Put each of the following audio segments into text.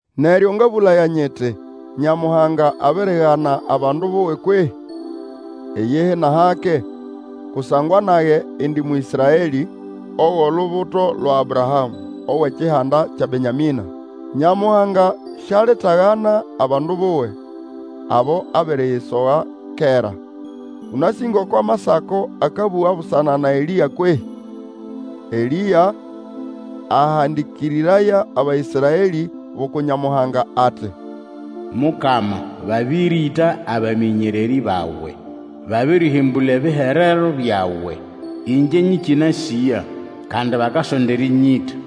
Neryo ngabũlaya nyiti, Nyamuhanga abirigana abandu buwe kwehĩ? Iyihi nʼahake! Kusangwa nage indi Mũĩsraelĩ, ogʼolubuto lwa Abrahamũ, owʼekihanda kya Benyamĩna. Nyamuhanga sialitagana abandu buwe, abo abiriyisoga kera. Ũnasĩ ngoko Amasako akabũga busana na Elĩa kwehĩ? Elĩa ahandĩkĩrĩraya Abaĩsraelĩ bʼuku Nyamuhanga ati, Mukama, babĩrĩta abamĩnyererĩ bawe, babĩrĩhĩmbũla ebiherero byawe. Ĩngye nyĩkĩnasĩya, kandi bakasonda erĩnylĩta.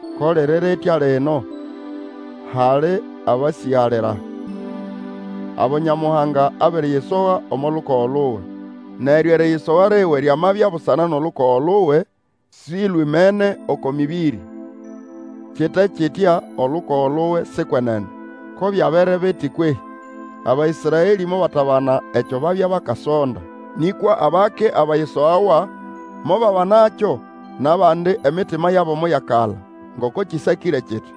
Ko liri ritya lino, hali abasĩgalira, abo Nyamuhanga abiriyisoga omo lukogo luwe. Neryo eriyisoga liwe lyamabya busana nʼolukogo luwe, silwimene oko mĩbĩrĩ. Kite kitya olukogo luwe si kwenene. Ko byabere biti kwehĩ? Abaĩsraelĩ mobatabana ekyo babya bakasonda. Nĩkwa abake abayisogawa mobabanakyo Nʼabandi emitima yabo moyakala. Ngoko kĩsakĩre kiti,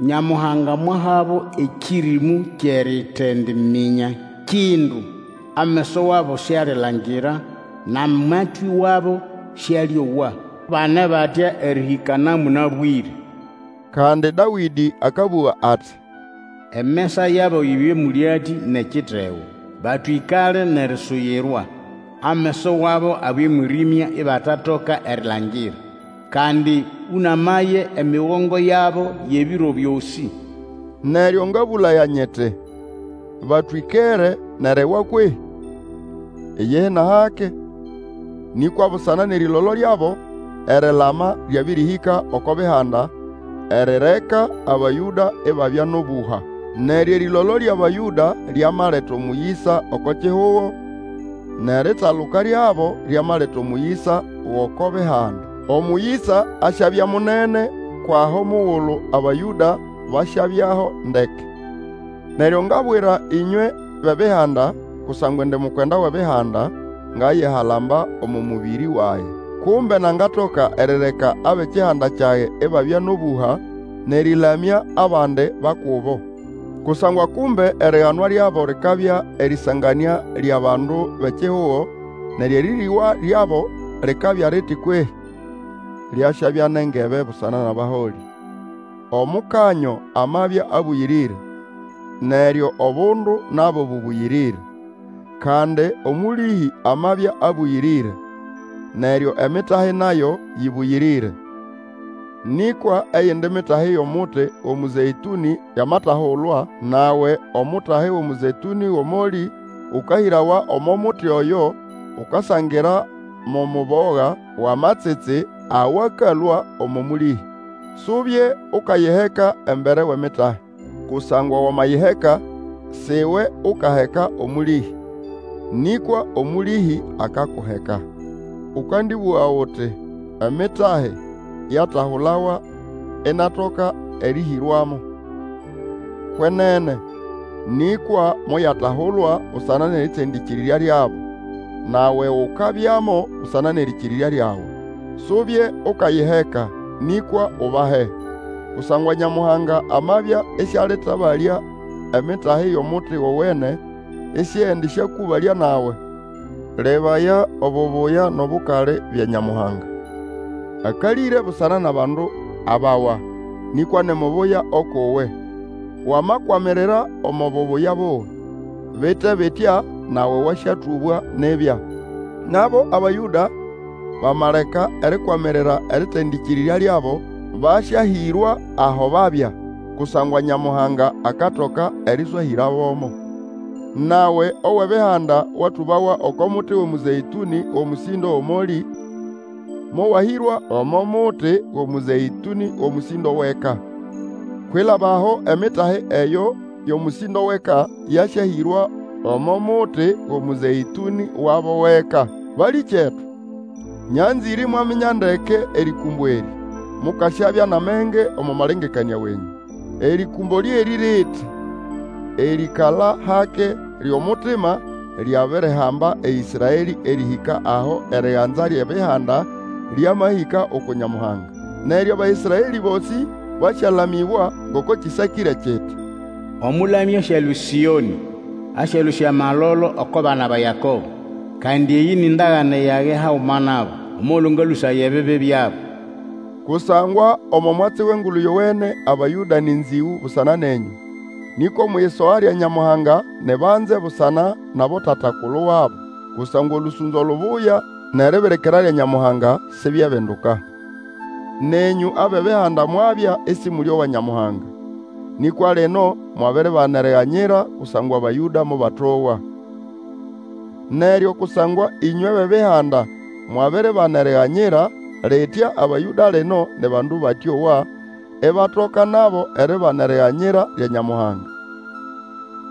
Nyamuhanga mwahabo ekĩrĩmũ kyʼeritendiminya kindu, Ameso wabo sialilangira, nʼamatwĩ wabo sĩalĩowa, Bane batya erĩhĩka na mũnabwĩre, Kandi Dawĩdĩ akabũga ati, Emesa yabo yibye mũlyatĩ nʼekitego. Batwĩkale nʼerisuyirwa. Ameso wabo abye mwĩrĩmya ibatatoka erilangira, Kandi ũnamaye emigongo yabo yʼebiro byosĩ. Neryo ngabũlaya nyiti, Batwĩkere nʼeriwa kwehĩ? Iyihi nʼahake! Nĩkwa busana nʼerĩlolo lyabo, erilama lyabĩrĩhĩka oko Bihanda, erireka Abayũda ibabya nʼobũha. Neryo erĩlolo lyʼAbayũda lyamaleta omũyĩsa oko kihugo, nʼeritaluka lyabo lyamaleta omũyĩsa gʼoko Bihanda. Omũyĩsa asyabya munene kwʼaho omugulu Abayũda basyabyaho ndeke. Neryo ngabwira ĩnywe bʼEbihanda, Kusangwa indi mukwenda wʼEbihanda, ngayihalamba omo mũbĩrĩ wage. Kumbe nangatoka erireka abʼekihanda kyage ibabya nʼobũha, nʼerĩlamya abandi ba kubo. Kusangwa kumbe eriganwa lyabo likabya erĩsanganĩa lyʼabandu bʼekihugo neryo erĩrĩgwa lyabo likabya liti kwehĩ? Lyasyabya nogebe busana nʼabaholĩ. Omukanyo amabya abũyĩrĩre, neryo obundu nabo bũbũyĩrĩrĩre. Kandi omũlĩhĩ amabya abũyĩrĩre, neryo emitahi nayo yĩbũyĩrĩre. Nĩkwa eyindi mitahi yʼomuti wʼomũzeĩtũnĩ yamatahulwa, nawe Omutahi wʼomũzeĩtũnĩ wʼomolĩ ũkahĩrawa omo muti oyo ukasangira mo muboga wʼamatsitsi awakalũa omo mũlĩhĩ. Subye ukayiheka embere wʼemitahi; kusangwa wamayiheka, si iwe Ukaheka omũlĩhĩ nĩkwa omũlĩhĩ akakuheka. Ũkandĩbũga uti, Emitahi yatahulawa inatoka erĩhĩrwamo. Kwenene, nĩkwa moyatahulwa busana nʼerĩtendĩkĩrĩrya lyabo, nawe ukabyamo busana nʼerĩkĩrĩrya lyawe. Subye ukayiheka, nĩkwa ubahe. Kusangwa Nyamuhanga amabya ĩsĩalĩtabalya emitahi yʼomuti gowene, ĩsĩendĩsyakũbalya nawe. Lebaya obubuya nʼobukali bya Nyamuhanga. Akalĩre busana nʼabandu abawa, nĩkwa ni mubuya ukʼuwe, wamakwamirira omo bubuya buwe. Bite bitya, nawe, wasyatũbwa nibya. Nabo Abayũda, bamaleka erikwamirira erĩtendĩkĩrĩrya lyabo, basyahĩrwa aho babya. Kusangwa Nyamuhanga akatoka erĩswahĩrabomo. Nawe owʼEbihanda watũbawa oko muti wʼomũzeĩtũnĩ wʼomũsĩndo wʼomolĩ, mowahĩrwa omo muti wʼomũzeĩtũnĩ wʼomũsĩndo wʼeka. Kwilaba aho emitahi eyo yʼomũsĩndo wʼeka yasyahĩrwa omo muti wʼomũzeĩtũnĩ wabo wʼeka. Balĩkyetu, nyanzĩre imwaminya ndeke erĩkũmbo erĩ, mukasyabya nʼamenge omo malengekanĩa wenyũ. Erĩkũmbo lyerĩ liti, erikala hake lyʼomutima lyabirihamba Ĩsraelĩ erĩhĩka aho eriganza NʼEbihanda lyamahĩka uku Nyamuhanga. Neryo Abaĩsraelĩ bosĩ basyalamĩbwa, ngoko kĩsakĩre kiti, Omũlamya asyalũa eSĩonĩ, Asyalũsya amalolo oko bana ba Yakobo. Kandi eyĩ ni ndagane yage haguma nabo, Omugulu ngalũsaya ebibi byabo. Kusangwa omo mwatsi wʼEngulu Yowene Abayũda, nĩ nzĩgũ busana nenyũ, nĩkwa omwʼiyisoga lya Nyamuhanga, ni banze busana nʼabotata-kulu wabo. Kusangwa olũsũnzo lubuya nʼeribirikira lya Nyamuhanga sibyebinduka. Nenyũ abʼEbihanda mwabya ĩsĩmũlĩowa Nyamuhanga, nĩkwa lino mwabiribana eriganyira kusangwa Abayũda mobatowa. Neryo kusangwa ĩnywe bʼEbihanda mwabiribana eriganyira, litya Abayũda lino ni bandu batyowa, ibatoka nabo eribana eriganyira lya Nyamuhanga.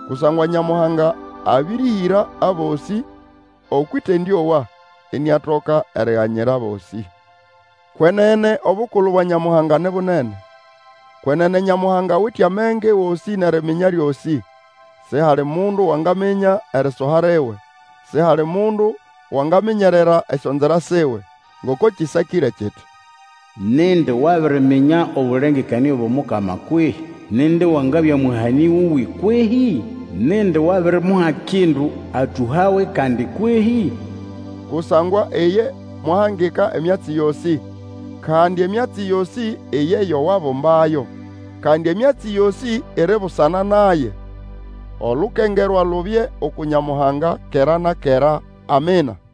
Kusangwa Nyamuhanga abĩrĩhĩra abosĩ okwʼĩtendĩowa, iniatoka eriganyira abosĩ. Kwenene obukulu bwa Nyamuhanga ni bunene! Kwenene Nyamuhanga awite amenge gosĩ nʼeriminya lyosĩ! Sihali mundu wangaminya erisoha liwe! Sihali mundu wangaminyerera esyonzira siwe! Ngoko kĩsakĩre kiti, Nindi wabiriminya obũlengekanĩa bwʼomukama kwehĩ? Nindi wangabya mũhanĩ wuwe kwehĩ? Nindi wabirimuha kindu, atũhawe kandi kwehĩ? Kusangwa iye mwahangika emyatsi yosĩ, kandi emyatsi yosĩ iye yo wabumbayo, kandi emyatsi yosĩ iri busana naye. Olukengerwa lubye uku Nyamuhanga kera na kera. Amina.